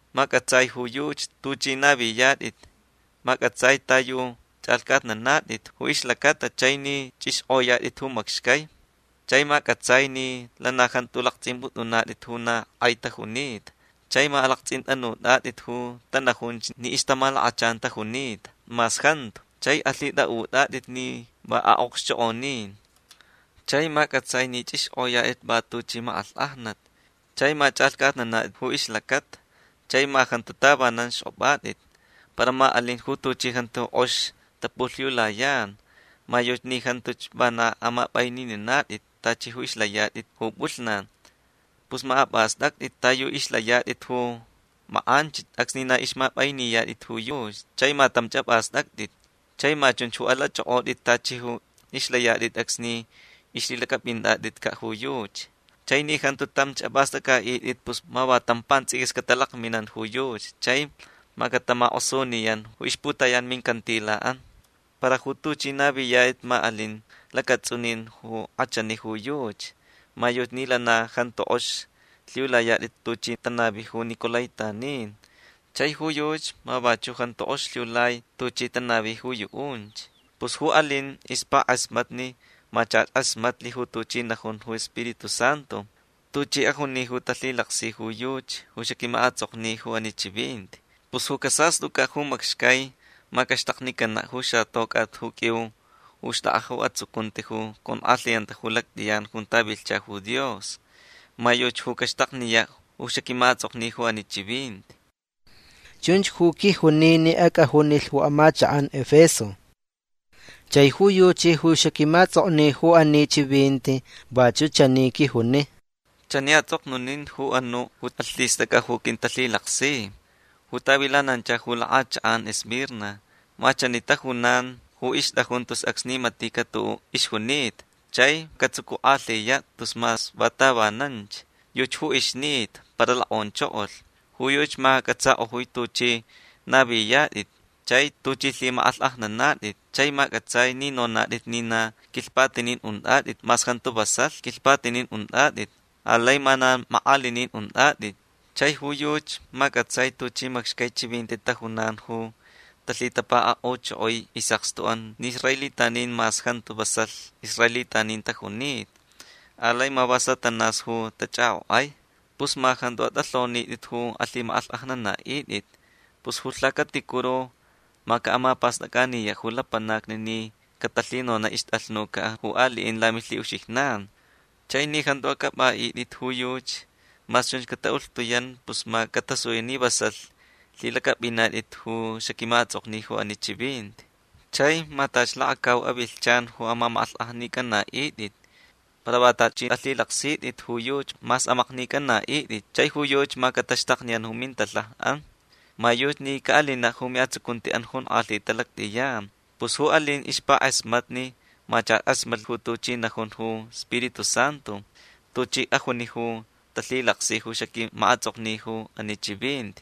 Ma c'atsai ju yuchi tuch'i naviyat'it. Ma c'atsai ta yu ch'alhc'atnanat'it ju ixlacata chai ni ch'ixk'oyat'it ju macxcai. Chai ma c'atsai ni lana jantu lakts'imp'ut'unat'it ju na k'ai tajunita. Chai ma alakts'int'anut'at'it ju tanajunch ni ixtamalakachan tajunita mas jantu chai alhit'a'ut'at'it ni va a'okxchok'onin. Chai ma c'atsai ni ch'ixk'oyat'it va tuchi mak'alhk'ajnat. Chai ma ch'alhc'atnanat'it ju ixlacata. Chai ma jantu tavanan xk'op'at'it. Para ma alin ju tuchi jantu k'ox tapulhiulayan. Ma yuchi ni jantuch vana amap'ainininat'it tachi ju ixlayat'it ju p'ulhnan. Pus ma ap'ast'act'it ta yu ixlayat'it ju mak'anchich acsni na ixmap'ainiyat'it ju yuchi. Chai ma tamch ap'ast'act'it. Chai ma chunchach ju alach'ok'ot'it tachi ju ixlayat'it acsni ixlhilac'ap'int'at'itca' ju yuchi. Chai ni jantu tamch ap'ast'ac'a'it'it pus ma va tam pants'iquis catalakminan ju yuchi chai ma catamak'osuniyan ju ixputayan ju mincantila'an. Para ju tuch'i naviyat'it ma alin lacats'unin ju k'achani ju yuchi. Ma yuchi ni lana jantu k'ox lhiulayat'it tuchi tanavi ju nicolaítanin. Chai ju yuchi ma vachu' jantu k'ox lhiulai tuchi tanavi ju yu'unch. Pus ju alin ixpak'asmatni ma chach k'asmatlh ju tuchi najun ju Spiritu Santu. Tuchi ajuni ju talhilaksi ju yuchi ju xaquima'ats'okni ju ani chivinti. Pus ju casast'uc'a' ju macxcai ma caxtaknicana' ju xatoc'at ju q'uiu ju xt'ak'a ju atsucunti ju conk'alhiyanta ju lact'iyan junta vilhcha ju Dios. Ma yuchi ju caxtakniya' ju xaquima'ats'okni ju ani chivinti”. Chunch ju quijuni ni ac'ajunilh ju amachak'an Efeso. Chai ju yuchi ju xaquima'ats'okni ju ani chivinti vachu' chani quijuni: “Chani ats'oknunin ju anu' ju alhist'ac'a ju quintalhilaksi ju tavilanancha ju lak'achak'an Esmirna. Ma chani tajunan ju ixt'ajun tus acsni matica' tu'u' ixjunita chai catsucuk'alhiya' tus mas va tavananch. Yuchi ju ixnita para lok'onchokolh. Ju yuchi ma c'atsak'ojui tuch'i naviyat'it chai tuch'i lhimak'alhk'ajnanat'it. Chai ma c'atsai ni nonat'it ni na quilhpatinin unt'at'it mas jantu vasalh quilhpatinin unt'at'it. Alai ma na mak'alinin unt'at'it. Chai ju yuchi ma c'atsai tuchi macxcai chivinti tajunan ju talhitapaka'uchokoi is'akstu'an ni israelitanin mas jantu vasalh israelitanin tajunita. Alai ma va Satanás ju tach'ak'ok'ai. Pus ma jantu at'alhonit'it ju alhimak'alhk'ajnana'it'it. Pus ju lhacaticuru ma ca'amapast'ac'aniya' ju lapanacni ni catalhinona' ixt'alhnuca ju ali'in lamilhi'uxijnan. Chai ni jantu ac'ap'a'it'it ju yuchi mas chunch cata'ulhtuyan pus ma catasuya' ni vasalh lhilac'ap'inat'it ju xaquima'ats'okni ju ani chivinti. Chai ma tachi lakacau avilhchan ju amamak'alhk'ajnic'ana'it'it. Para va tachi alhilaksit'it ju yuchi mas amaknic'ana'it'it chai ju yuchi ma cataxtakniyan ju mintalhaja'an. Ma yuchi ni ca'alina' ju mi'atsucunti'an jonk'alhita lact'iyan. Pus ju alin ixpak'asmatni ma chach k'asmatlh ju tuchi najun ju Spiritu Santu. Tuchi ajuni ju talhilaksi ju xaquima'ats'okni ju ani chivinti.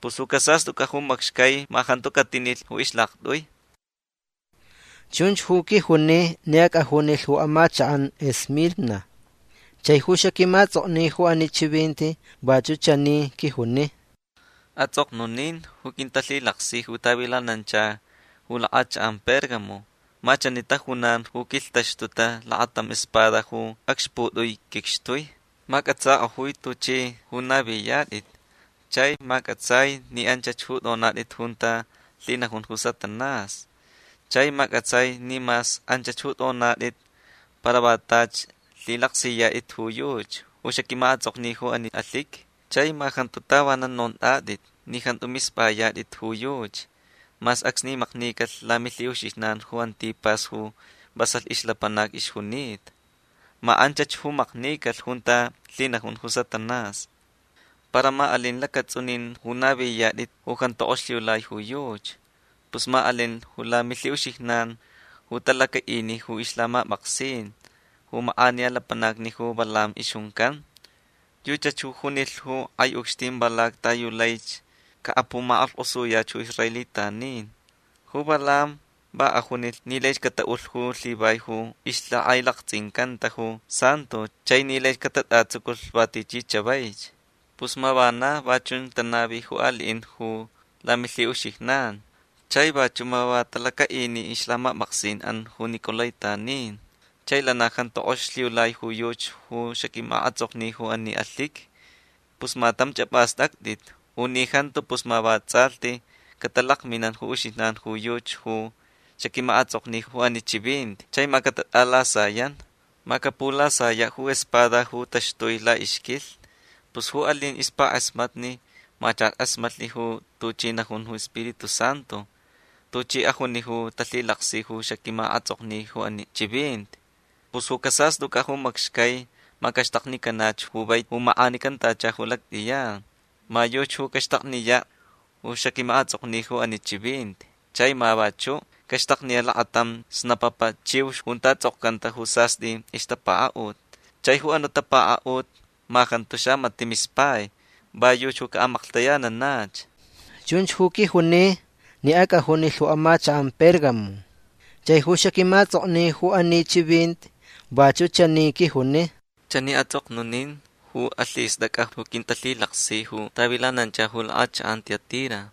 Pus ju casast'uc'a' ju macxcai ma jantu catinilh ju ixlakt'ui”. Chunch ju quijuni ni ac'ajunilh ju amachak'an Esmirna. Chai ju xaquima'ats'okni ju ani chivinti vachu' chani quijuni: “Ats'oknunin ju quintalhilaksi ju tavilanancha ju lak'achak'an Pérgamo. Ma chani tajunan ju quilhtaxtuta lakatam espada ju acxput'ui quicxtui. Ma c'atsak'ojui tuch'i ju naviyat'it. Chai ma c'atsai ni anchach ju t'onat'it junta lhinajun ju Satanás. Chai ma c'atsai ni mas anch ju t'onat'it para va tachi lhilaksiyat'it ju yuchi ju xaquima'ats'okni ju ani alhiqui. Chai ma jantu tavanan nont'at'it ni jantu misp'ayat'it ju yuchi mas acsni maknicalh lamilhi'uxijnan ju Antipas ju vasalh ixlapanac ixjunita. Ma anchach ju maknicalh junta lhinajun ju Satanás. Para ma alin lacats'unin ju naviyat'it ju jantu k'ox lhiulai ju yuchi. Pus ma alin ju lamilhi'uxijnan ju talaca'ini ju ixlhamap'aksin ju mak'aniya lapanac ju Balaam ixjuncan. Yuchach ju junilh ju k'ai ucxtin Balac ta yu laich ca'apumak'alhk'osuyach ju israelitanin. Ju Balaam va ajunilh ni laich cata'ulh ju lhivai ju ixlhak'ailakts'incanta ju santo chai ni laich catat'atsuculh va tichi chavaich. Pus ma vana va chunch tanavi ju ali'in ju lamilhi'uxijnan. Chai vachu' ma va talaca'ini ju ixlhamap'aksin'an ju nicolaítanin. Chai lana jantu k'ox lhiulai ju yuchi ju xaquima'ats'okni ju ani alhiqui. Pus ma tamch ap'ast'act'it. U ni jantu pus ma vats'alhti catalakminan ju uxijnan ju yuchi ju xaquima'ats'okni ju ani chivinti chai ma catat'alasayan. Ma capulasaya' ju espada ju taxtui la'ixquilhni. Pus ju alin ixpak'asmatni ma chach k'asmatlh ju tuchi najun ju Spiritu Santu. Tuchi ajuni ju talhilaksi ju xaquima'ats'okni ju ani chivinti. Pus ju casast'uc'a' ju macxcai ma caxtaknicanach ju vaiti ju mak'anicantacha ju lact'iyan. Ma yuchi ju caxtakniya' ju xaquima'ats'okni ju ani chivinti. Chai ma vachu' caxtakniya' lakatam xnapapa chiux junta ts'okcanta ju sast'i ixtapaka'ut. Chai ju anu' tapaka'ut ma jantu xamati' mispai. Va yuchi ju ca'amaklhtayananach”. Chunch ju quijuni ni ac'ajunilh ju amachak'an Pérgamo. Chai ju xaquima'ats'okni ju ani chivinti vachu' chani quijuni: “Chani ats'oknunin ju alhist'ac'a ju quintalhilaksi ju tavilanancha ju lak'achak'an Tiatira.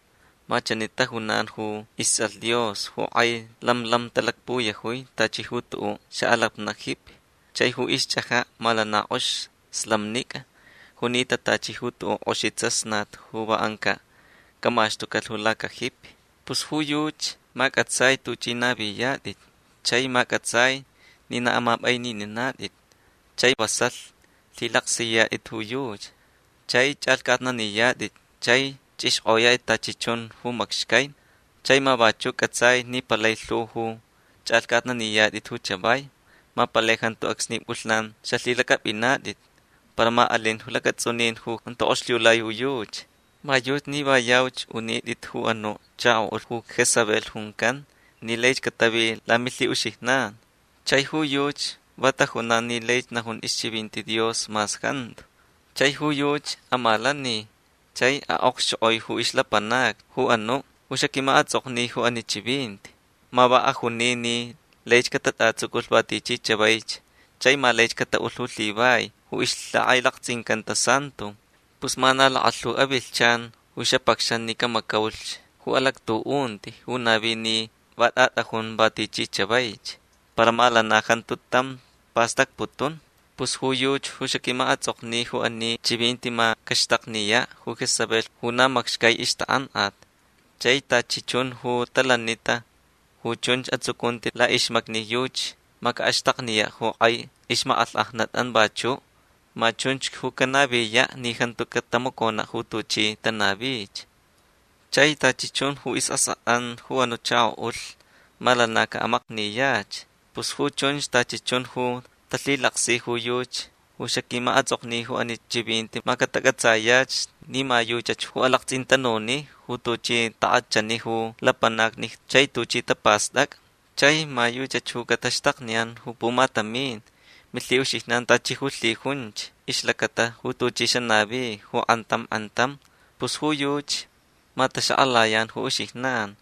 Ma chani tajunan ju ists'alh Dios ju k'ai lam lam talakpuyajui tachi ju tu'u' xa'alapna' jipi. Chai ju ixch'aja' ma lana k'ox slamnic'a junita tachi ju tu'u' k'oxi tsasnat ju va anca' camaxtucalh lacajipi. Pus ju yuchi ma c'atsai tuch'i naviyat'it. Chai ma c'atsai ni na amap'ainininat'it chai vasalh lhilaksiyat'it ju yuchi. Chai ch'alhc'atnaniyat'it chai ch'ixk'oyat'it tachi chun ju macxcai. Chai ma vachu' c'atsai ni palai lhu ju ch'alhc'atnaniyat'it ju chavai. Ma palai jantu acsni p'ulhnan xalhilac'ap'inat'it. Para ma alin lacats'unin ju jantu k'ox lhiulai ju yuchi. Ma yuchi ni va yauch unit'it ju anu' chako'ulh ju Jezabel juncan ni laich catavi lamilhi'uxijnan. Chai ju yuchi va tajunan ni laich najun ixchivinti Dios mas jantu. Chai ju yuchi amalani chai a'okxchok'oi ju ixlapanacni ju anu' ju xaquima'ats'okni ju ani chivinti. Ma va ajuni ni laich catat'atsuculh va tichi chavaich chai ma lai cata'ulh ju lhivai ju ixlhak'ailakts'incanta santo. Pus ma na lakalhu avilhchan ju xapacxan ni camacaulich ju alactu'unti ju navi ni va t'at'ajun va tichi chavaich. Para ma lana jantu tam pastacputun. Pus ju yuchi ju xaquima'ats'okni ju ani chivinti ma caxtakniya' ju Jezabel ju na macxcai ixtak'ank'at. Chai tachi chun ju talanita ju chunch atsucunti la'ixmacni yuchi ma ca'axtakniya' ju k'ai ixmak'alhk'ajnat'an vachu'. Ma chunch ju canaviya' ni jantu catamacona' ju tuchi tanavich. Chai tachi chun ju is'ask'at'an ju anu' chako'ulh ma lana ca'amakniyach. Pus ju chunch tachi chun ju talhilaksi ju yuchi ju xaquima'ats'okni ju ani chivinti ma catac'atsayach ni ma yuchach ju alakts'intanuni ju tuchi tak'achani ju lapanacni chai tuchi tapast'ac'a. Chai ma yuchach ju cataxtakniyan ju pumatamin milhi'uxijnan tachi ju lhijunch ixlacata ju tuchi xanavi ju k'antam k'antam. Pus ju yuchi ma taxak'alayan ju uxijnan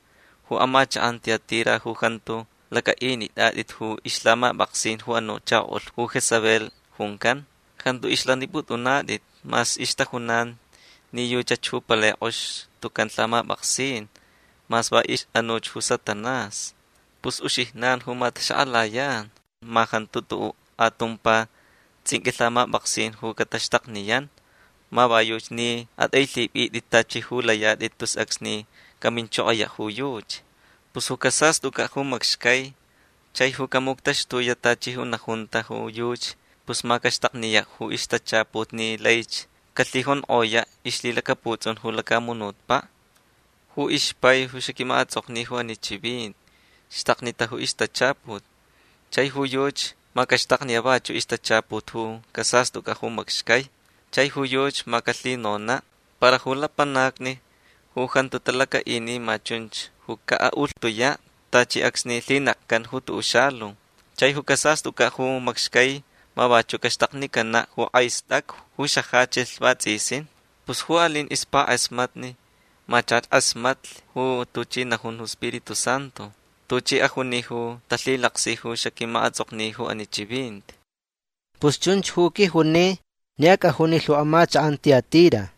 ju amachak'an Tiatira ju jantu lac'a'init'at'it ju ixlhamap'aksin ju anu' chako'ulh ju Jezabel juncan. Jantu ixlanip'ut'unat'it mas ixtajunan ni yuchach ju palai k'ox tucan lhamap'aksin mas va ix'anuch ju Satanás. Pus uxijnan ju ma taxak'alayan. Ma jantu tu'u' atumpa ts'inq'ui lhamap'aksin ju cataxtakniyan. Ma va yuchi ni at'ailhip'it'it tachi ju layat'it tus acsni caminchokoya' ju yuchi. Pus ju casast'uc'a' ju macxcai chai ju camuctaxtuya' tachi ju najunta ju yuchi pus ma caxtakniya' ju ixtachaput ni laich calhijonk'oya' ixlhilacaputs'un ju lacamunutpa'. Ju ixpai ju xaquima'ats'okni ju ani chivinti xtaknita ju ixtachaput. Chai ju yuchi ma caxtakniya' vachu' ixtachaput ju casast'uc'a' ju macxcai. Chai ju yuchi ma calhinona'. Para ju lapanacni ju jantu talaca'ini ma chunch ju ca'a'ulhtuya' tachi acsni lhinekcan ju tu'u' xalu. Chai ju casast'uc'a' ju macxcai ma vachu' caxtaknicana' ju k'ai st'acu ju xajachilh vats'isin. Pus ju alin ixpak'asmatni ma chach k'asmatlh ju tuchi najun ju Spiritu Santu. Tuchi ajuni ju talhilaksi ju xaquima'ats'okni ju ani chivinti”. Pus chunch ju quijuni ni ac'ajunilh ju amachak'an Tiatira.